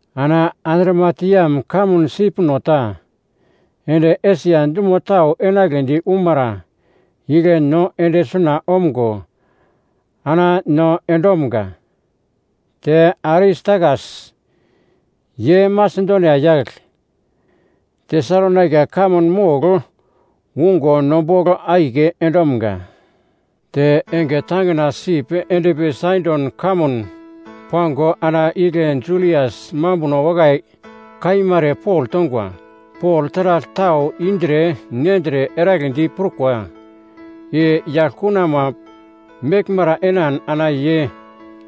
Ana Adramitiam kamun sipno ta ende Esia dumo tau enagledi umara igle no ende suna omgo ana no endomga. Te Aristakas, ye Masedonia yagl, Tesalonaika kamun mogl ungo no bogl akiye endomga. Te enge tangina sip endpi Saidon kamun pango ana igle Julias mambuno wakai kaima ere Pol tongwa. Pol taragl tau indre nendre eragledi prukwa i yaglkunama meglmara enan ana ye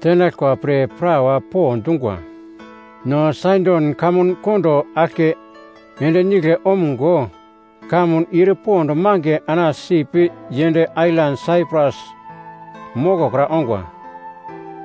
tenaglkwa pre prawa po dungwa. No Saidon kamun kondo aglke ende nigle omgo kamun ir pond mange ana sip yend ailan Saiprus mokokra ongwa.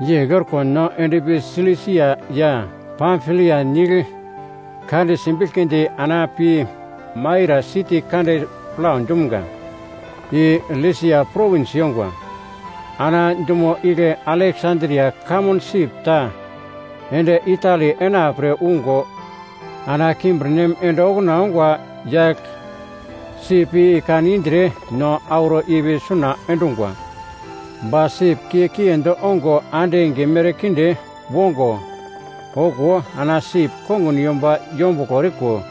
Yegl orko no endpi Silisia ya Pamfilia nigl kande simbiglkidi ana pi Maira siti kande plau dumga, i Liasia Provins yongwa. Ana dumo igle Aleksandria kamun sip ta ende Itali enapre ungo ana kimbirnem ende okuna ongwa yagl sip i kan indre no auro ipi suna endungwa. Ba sip kiye kiendi ongo ande enge merkinde wongo, okuwo ana sip kongun yomba yombuglo eriko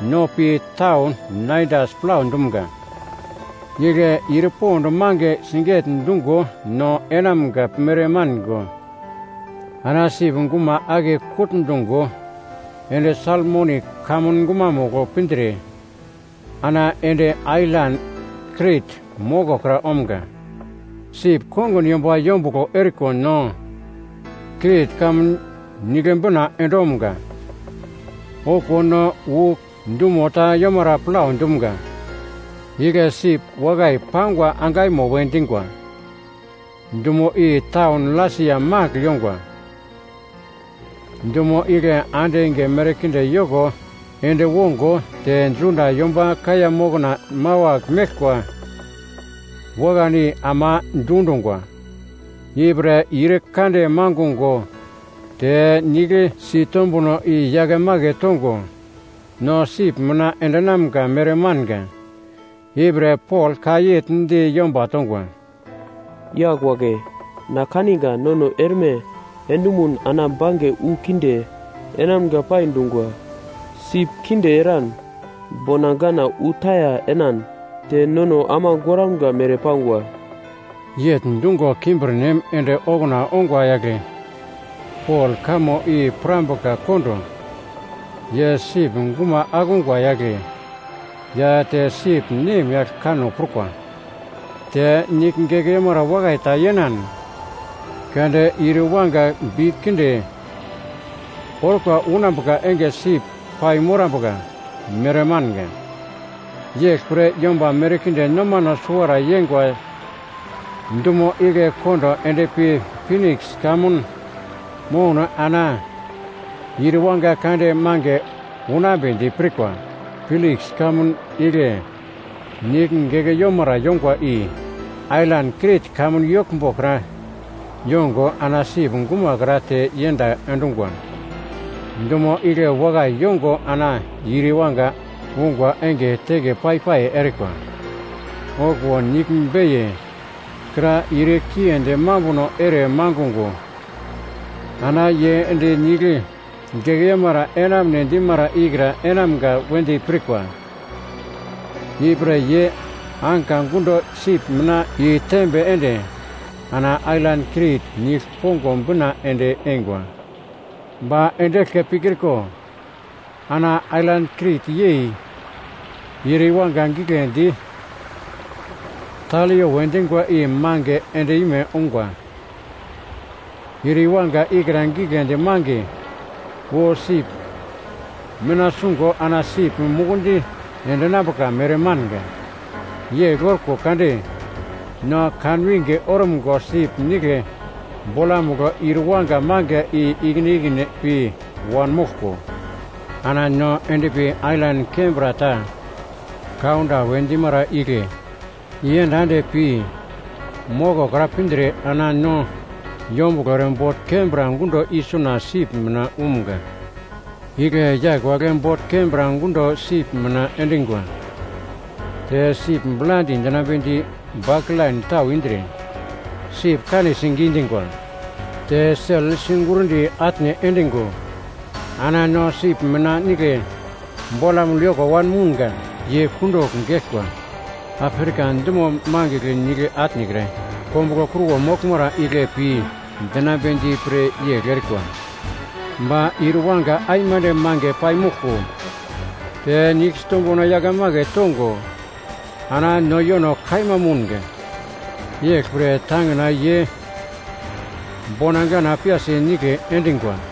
no pi taun Naidas plau dumga. Igle ir pond mange siget-dungo no enamga mere mango ana sip guma ake kutndungo ende Salmoni kamun gumamugl pindre ana ende ailan Krit moko kra omga. Sip kongun yomba yombuglo eriko no Krit kamun nigle bina endomga. Okuwo no wu dumo ta yomara plau dumga, igle sip Wakai Pangwa Angaimo we dingwa. Dumo i taun Lasia magl yongwa. Dumo igle ande enge merkinde yoko ende wongo te Juda yomba kaiya mokna mawagl meglkwa wakan i ama dundungwa. Ipre ir kande mangungo te nigl sitombuno i-yake make tongo no sip mina endinamga mere manga. Ipre Pol ka yegl di yomba tongwa, “Yagl wagle, na kaninga nono erme endomun ana bange wu kinde enamga pai dungwa. Sip kinde eran, bona gana wu taya enan te nono ama goramga mere pangwa.” Yegl dungo kimbirnem ende okuna ongwa yagle Pol kamo i pirambuka kondo ye sip guma akungwa yagle ya te sip nemyagl kanno prukwa. Te nigl gingiu wakai ta yenan kade ir iwanga bi kinde orkwa unambuka enge sip pai morambuka mere manga. Yeglpre yomba merkinde nomano suwara yeingwa dumo igle kondo endpi Piniks kamun mouno ana ir iwanga kande mange unambedi pirkwa. Piniks kamun nigl gingiu yongwa i ailan Krit kamun yoglmbo kra yongo ana sip gumakra te yend endungwa. Dumo igle wakai yongo ana ir iwanga ungwa enge teke pai-pai erikwa. Okuwo nigl beiye kra ir kiendi mambuno ere mangungo, ana ye ende nigl gingiu enamune dimara ikra enamga wedi pirkwa. Ipre ye anka gundo sip mina i-tembe ende ana ailan Krit nigl pongo bina ende eingwa. Ba ende eglke pikriko, ana ailan Krit yei ir iwanga giglendi ‘Taleo’ we dingwa i mange end-ime ungwa. Ir iwanga ikra giglendi mange wu sip mina sungo ana sip mukundi endinambuka mere manga. Yegl orko kade no kanwinge orumgo sip nigle bolamugl ir wanga mange i-ikine ikine pi wanmoglko, ana no endpi ailan kembra ta Kauda we dimara igle iyenda ende pi mokokra pindre ana no yombuglo ere bot kembra gundo isuna sip mina umga. Igle yagl wagle bot kembra gundo sip mina endingwa. Te sip bladi dinambedi baklain tau indre sip kanesi gidingwa. Te sel sigurndi atne endingo ana no sip mina nigle bolamugl yoko wanmounga. Ye kundugl geglkwa Afrika dumo mangigl nigl atne kra kombuglo kruwo moglmara igle pi dinambedi pre yegl erikwa. Ba ir iwanga aimande mange paimoglko te nigl sitombuno yakemake tongo ana no yono kaima mounga, yeglpre tangina ye bona gana piyasi nigle endingwa.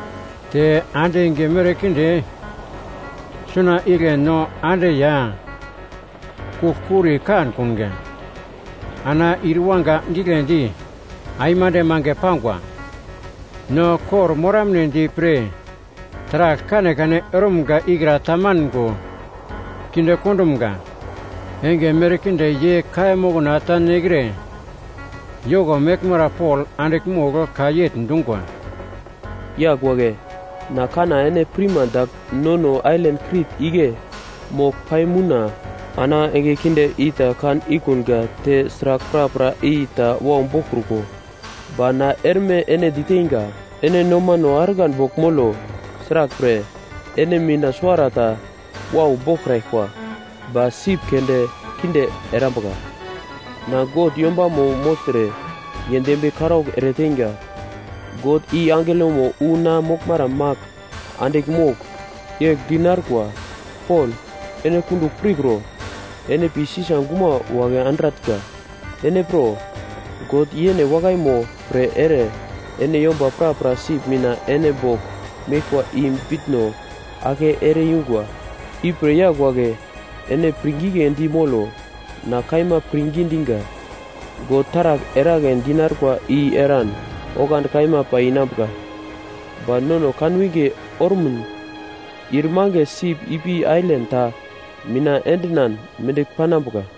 Te ande enge merkinde suna igle no ande ya kugl-kuri kankunga, ana ir iwanga giglendi aimande mange pangwa. No kor-moramnedi pre taragl kanekane erumga ikra tamango kinde kondumga. Enge merkinde ye kaiya mokna ta nekre yoko meglmara Pol andigl mogl ka yegl dungwa, “Yagl wagle, na kanna ene pirma dagl nono ailan Krit igle mogl paimouna ana enge kinde i ta kan ikunga te sragl prapra i ta wau boglkruko. Ba na erme ene diteinga, ene nomano argan bogl molo. Sraglpre, ene mina suwarata wau boglkraglkwa, ba sip keunde kinde erambuka. Na God yombamo mogltre ye dembiye karaugl ere teinga, God i angelomo wu na moglmara magl andigl mogl, yegl di narkwa, ‘Pol, ene kundugl pirkro! Ene pi Sisa guma wagle andratnga. Ene pro, God yene wakaimo pre ere ene yomba prapra sip mina ene bogl meglkwa i bitno ake ere yungwa.’ Ipre yagl wagle, ene pirngigledi molo. Na kaima pirngi dinga: God taragl eragle dinarkwa i eran oglandi kaima pai inambuka. Ba nono kanwinge ormun ir mange sip ipi ailan ta mina endinan mendigl panambuka.”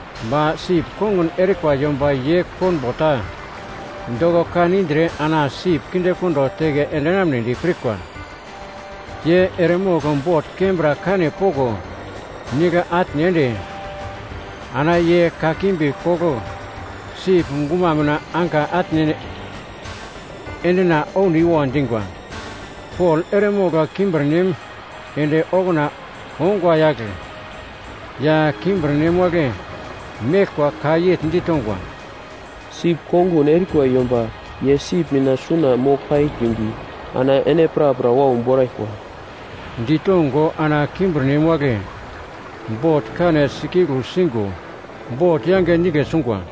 Ba sip kongun erikwa yomba ye konbo ta doko kan indre ana sip kindekondo teke endinamnedi pirkwa. Ye eremogl bot kembra kane poko nigle atne ende ana ye kakimbi kogl sip guma mina anka atne endina ouniwo dingwa. Pol eremogl kimbirnem ende okuna ongwa yagl ya kimbirnem wagle meglkwa ka yegl ditongwa, “Sip kongun erikwa yomba ye sip mina suna mogl paikrimbi ana ene prapra wau boraglkwa.” Ditongo ana kimbirnem wagle bot kane sikeglu singo bot yange nigle sungwa.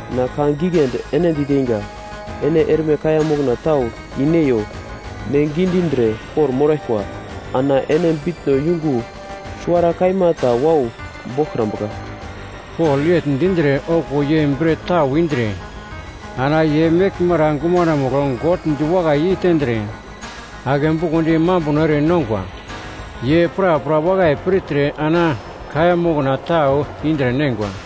Na ka giglendi ene diteinga, ene erme kaiya mokna tau i-neiyo. Ne gidindre kor-moraglkwa. Ana ene bitno yungo suwara kaima ta wau boglkrambuka.” Pol yegl dindre okuwo ye bret tau indre ana ye meglmara gumanomugl God diwakai yeitendre, ake bukondi mambuno ere nongwa. Ye prapra wakai pirtre ana kaiya mokna tau indre neingwa.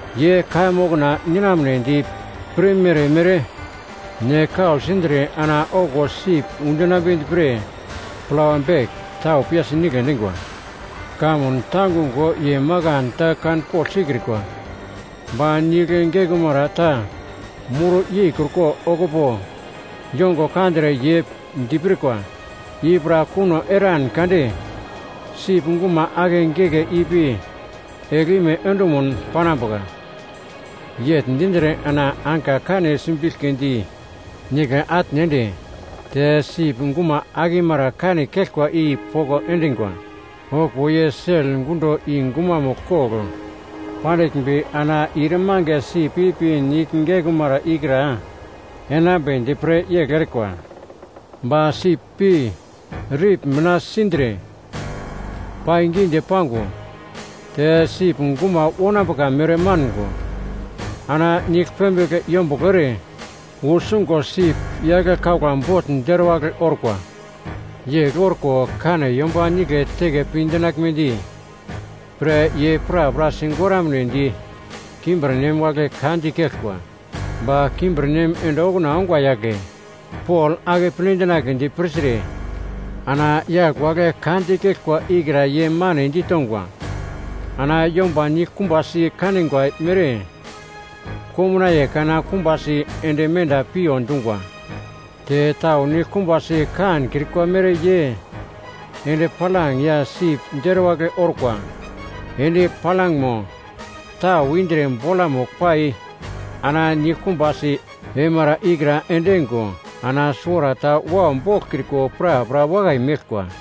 Ye kaiya mokna ninamnedi pirmere-mere ne kau sindre ana okuwo sip undinambedi pre plawa bek tau piyasi nigle endingwa. Kamun tangungo ye makan ta kanpogl sikrikwa ba nigl gingiu ta mur yekruko okupo yongo kandre ye dipirkwa, i pra kuno eran kade sip guma ake geke ipi eglime endumuno panambuka. Yegl dindre ana anka kane simbiglkidi nigle atne ende te sip guma akimara kane keglkwa i poko endingwa. Okuwo ye sel gundo i-gumamugl kogl pandiglmbi ana ir mange sip ipi nigl gingiu ikra enambedi pre yegl erikwa. Ba sip pi rip mina sindre paigidi-pango, te sip guma wonambuka mere mango ana nigl pembigl yombuglo ere wu sungo sip yagle kaugla bogl deruwagl orkwa. Yegl orko kane yomba nigle teke pi dinaglmedi pre ye prapra sigoramnedi kimbirnem wagle ka dikeglkwa. Ba kimbirnem ende okuna ongwa yagle Pol akeple dinagledi pirtre ana yagl wagle ka dikeglkwa ikra ye mane ditongwa. Ana yomba niglkumbasi kanigwa mere komnaiye kana kumbasi ende menda piyo dungwa. Te tau niglkumbasi kankrikwa mere ye endi-palang ya sip deruwagl orkwa endi-palangmo tau indre bolamugl pai ana nigl kumbasi eimara ikra endingo ana suwarata wau boglkriko prapra wakai meglkwa.